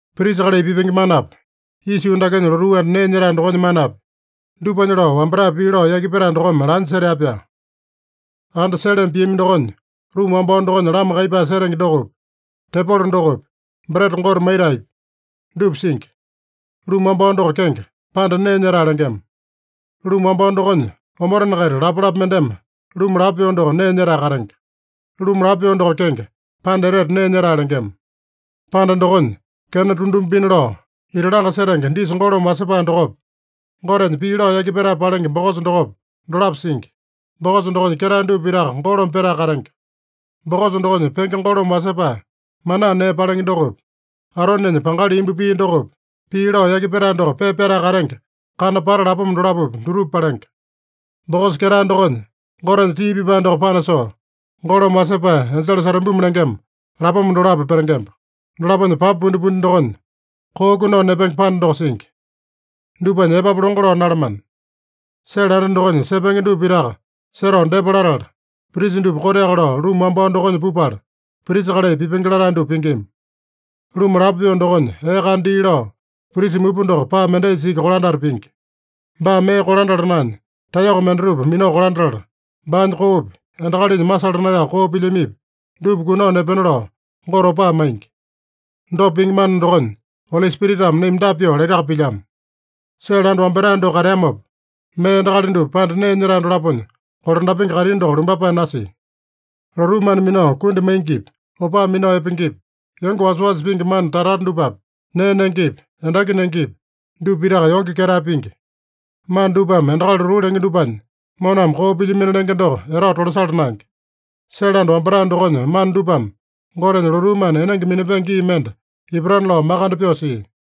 Prisa kalai pipenge manapi, isa yuu dakenya lotuu anda nee nyetae dokonya manapi, dupanya lao wambatae pii lao yaki petae dokome lanya setea-pyaa. Anda seleme piami dokonya ruma wambao dokonya lama kaiyepae setenge dokopi, tepolo dokopi, breta Gote maitaepi, dupa singi. Ruma wambao doko kenge, Panda Nee Nyetae lengema. Ruma wambao dokonya omotena-kaita lapalapa mendeme ruma lapo pyoo doko nee nyetae katenge. Ruma lapo pyoo doko kenge, Panda Etete Nee Nyetae lengema. Panda dokonya, kena tunduma pina lao ita langa setenge disa golome wasepae dokopa, Gotenya pii lao yaki petae palenge bokosa dokopa, dolapo singi. Bokosa dokonya ketae dupa pitaka golome petae katenge. Bokosa dokonya penge golome wasepae manaa nee palenge dokopi, Aronenya pangali imbu pia dokopi, pii lao yaki petae doko pepa pyatae katenge kana pata lapoma dolapopi, dutupa palenge. Bokosa ketae dokonya, Gotenya tii pipae doko panasoo, golome wasepae enjele setubimi lengema lapoma dolapo petengemba. Dolaponya papa pundipundi dokonya, koo kunao nepenge panda doko singi. Dupanya epapu longo lao nalamana. Sele anda dokonya sepenge dupa pitaka setao depa latala, prisa dupa koteaka lao ruma wambao dokonya pupala, prisa kalai pipenge latae dupa pingima. Ruma lapo pyoo dokonya ee kana dii lao, prisa mupa doko paa mendaisa iki kolandata pingi. Baa mee kolandala naenya, taeyoko mendatupa minao kolandatala, baanya koopi, endakalinya masala naeyao koo pilyamipi, dupa kunao nepena lao Gote opaa maingi. Dopa pingi mana dokonya Oli Spiritame naima dapa pyoo laitaka pilyamo: Sele anda wambatae doko kateamopa, mee endakali dupa panda nee nyetae dolaponya kolandapenge kaitini doko lumbapae nasia. Lotuu mana minao kundi maingipi, opaa minao epengepi, yonge wasawasa pingi mana tata-tata dupapi, nee nengepi, endaki nengepi, dupa pitaka yonge-ketae pingi. Mana dupame endakali lotuu lenge dupanya moname koo pilyamino lenge doko etao tolasala naenge. Sele anda wambatae dokonya mana dupame, Gotenya lotuu mana enenge minapenge gii mende ipatana lao makande pyoo sia.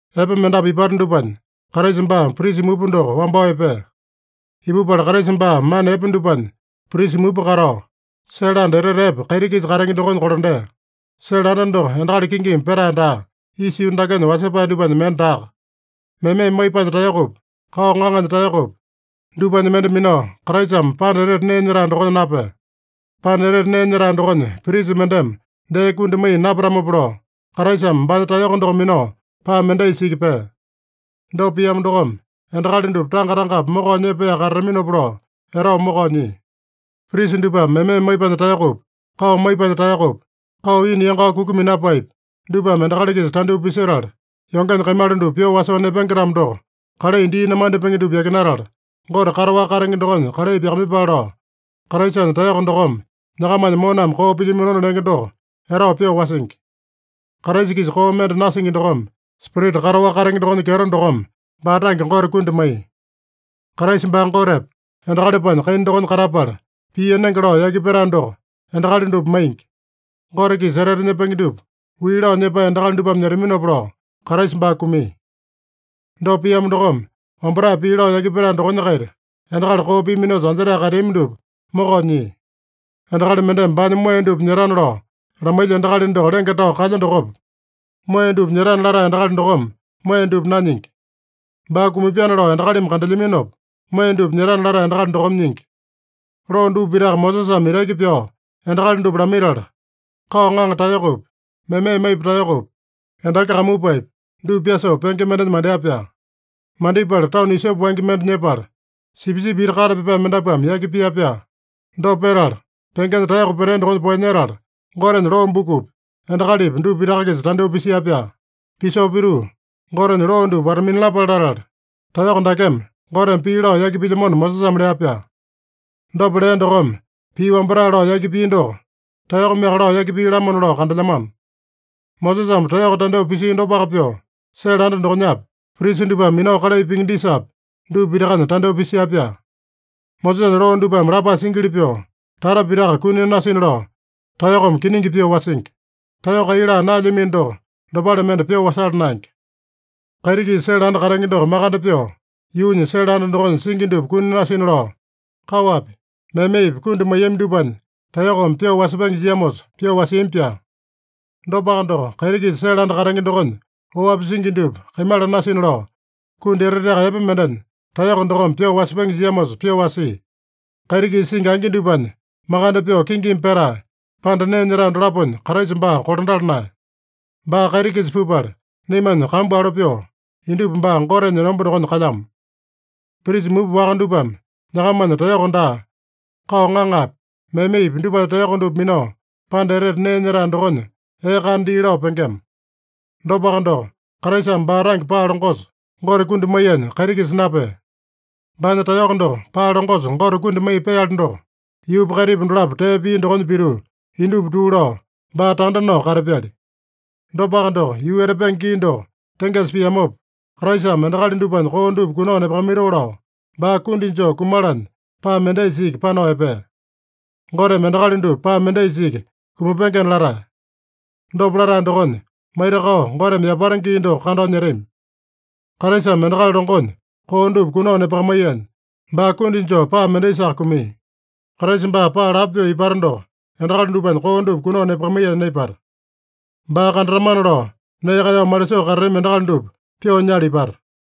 Epe mendapu ipata dupanya Kraisa baa prisa mupa doko wambao epea. Ipupala Kraisa baa mana epe dupanya prisa mupa katao, sele anda etete epe kaiti-kisa katenge dokonya kolandea. Sele anda doko endakali kingimi petae daa. Isa yuu dakenya wasepae dupanya mende daaka. Meme maipanya taeyokopi, kao ŋaŋanya taeyokopi, dupanya mende minao Kraisame Panda Etete Nee Nyetae dokonya napea. Panda Etete Nee Nyetae dokonya prisa mendeme dee kundi maiya napatamopa lao, Kraisame baanya taeyoko doko minao paa mendaisa iki pea. Dopa piamo dokome, endakali dupa tanga-tangapi mokao nyepaeyaka katataminopa lao etao mokao nyia. Prisa dupame meme maipanya taeyokopi, kao maipanya taeyokopi, kao ina yangao kuku minapaepi, dupame endakali-kisa tandyoo pisetala, yongenya kaimala dupa pyoo wasoo nepenge-tamo doko, kalai dii namandipenge dupa yakinatala, Gote kataowaka katenge dokonya kalai pyakamaiyepale lao, Kraisanya taeyoko dokome nyakamanya moname koo pilyaminona lenge doko etao pyoo wasingi. Kraisa-kisa koo mende nasingi dokome, Spirita kataowaka katenge dokonya kyeto dokome, baa tange Gote kundi maiya. Kraisa baa Gotepa, endakalipanya kaina dokonya katapala, pii enenge lao yaki petae doko endakali dupa maingi. Gote-kisa etete nyepenge dupa wii lao nyepae endakali dupame nyetaminopa lao, Kraisa baa kumia. Dopa piamo dokome, wambatae pii lao yaki petae dokonya-kaita endakali koo piaminosa anjetae kateami dupa mokao nyia. Endakali mendeme baanya moeya dupa nyetana lao lamailya endakali doko lenge tao kalya dokopa, moeya dupa nyetana latae endakali dokome moeya dupa nanyingi. Baa kumapyana lao endakalimi kandelyaminopa, moeya dupa nyetana latae endakali dokome nyingi. Loo dupa pitaka Mosesame itaki pyao endakali dupa lamaitala, kao ŋaŋa taeyokopi, meme maipa taeyokopi, endaki kamupaepi, dupa pyasoo penge mendenya mandea-pyaa. Mandipala tanu isope wangya mende nyepala, sipisipi iti kate pyapae mendapuame yaki pia-pyaa. Dopa petala, pengenya taeyoko petea dokonya poeyanyetala, Gotenya loo bukupi, endakalipi dupa pitaka-kisa tandyoo pisia-pyaa. Pisoo pituu, “Gotenya loo dupa wata-minalapale latala, taeyoko dakeme Goteme pii lao yaki pilyamona” Mosesame lea-pyaa. Dopa lea dokome, pii wambatae lao yaki pia doko, taeyokomeaka lao yaki pia-lamona lao kandelyamano. Mosesame taeyoko tandyoo pisia dopaka pyoo, sele anda dokonyapi, prisa dupame minao kalai pingi disapi, dupa pitakanya tandyoo pisia-pyaa. Mosesanya loo dupame lapae singili pyoo, tata pitaka kuni nasina lao taeyokome kiningi pyoo wasingi. Taeyoko kai laa naelyamino doko, dopale mende pyoo wasala naenge. Kaiti-kisa sele anda katenge doko makande pyoo, yuunya sele anda dokonya singi dupa kuni nasina lao, kaowapi, memepi kundi maiyami dupanya taeyokome pyoo wasepenge jiamosa pyoo wasiami-pyaa. Dopaka doko, kaiti-kisa sele anda katenge dokonya oapi singi dupa kaimala nasina lao, kundi eteteaka epe mendenya taeyoko dokome pyoo wasepenge jiamosa pyoo wasia. Kaiti-kisa singi angi dupanya makande pyoo kingimi petae, panda nee nyetae dolaponya Kraisa baa kolandala naeya. Baa kaiti-kisa pupala, naimanya kambu alo pyoo, indupa baa Gotenya enomba dokonya kalyamo. Prisa mupa waka dupame nyakamanya taeyoko daa, kao ŋaŋapi, memepi dupanya taeyoko dupa minao, Panda Etete Nee Nyetae dokonya ee kana dii lao pengema. Dopaka doko, Kraisame baa tange paa longosa Gote kundi maiyanya kaiti-kisa napea. Baanya taeyoko doko paa longosa Gote kundi maiya peali doko, yuupa kaitipa dolapo tee pia dokonya pituu, indupa tuu lao, baa tanda nao katapyali. Dopaka doko, yuu etapenge gii doko tengesa piamopa, Kraisame endakali dupanya koo dupa kunao nepakamaitoo lao, baa kundi joo kumalanya paa mendaisa iki panao epea. Goteme endakali dupa paa mendaisa iki kumapengena latae. Dopa latae dokonya, maitakao Goteme yapata gii doko kandao nyetami. Kraisame endakali longonya koo dupa kunao nepakamaiyanya, baa kundi joo paa mendaisaka kumia. Kraisa baa paa lapo pyoo ipata doko, endakali dupanya koo dupa kunao nepakamaiyanya naipata. Baa kandatamana lao nee kaeyao malisoo katatami endakali dupa pyoo nyala ipata.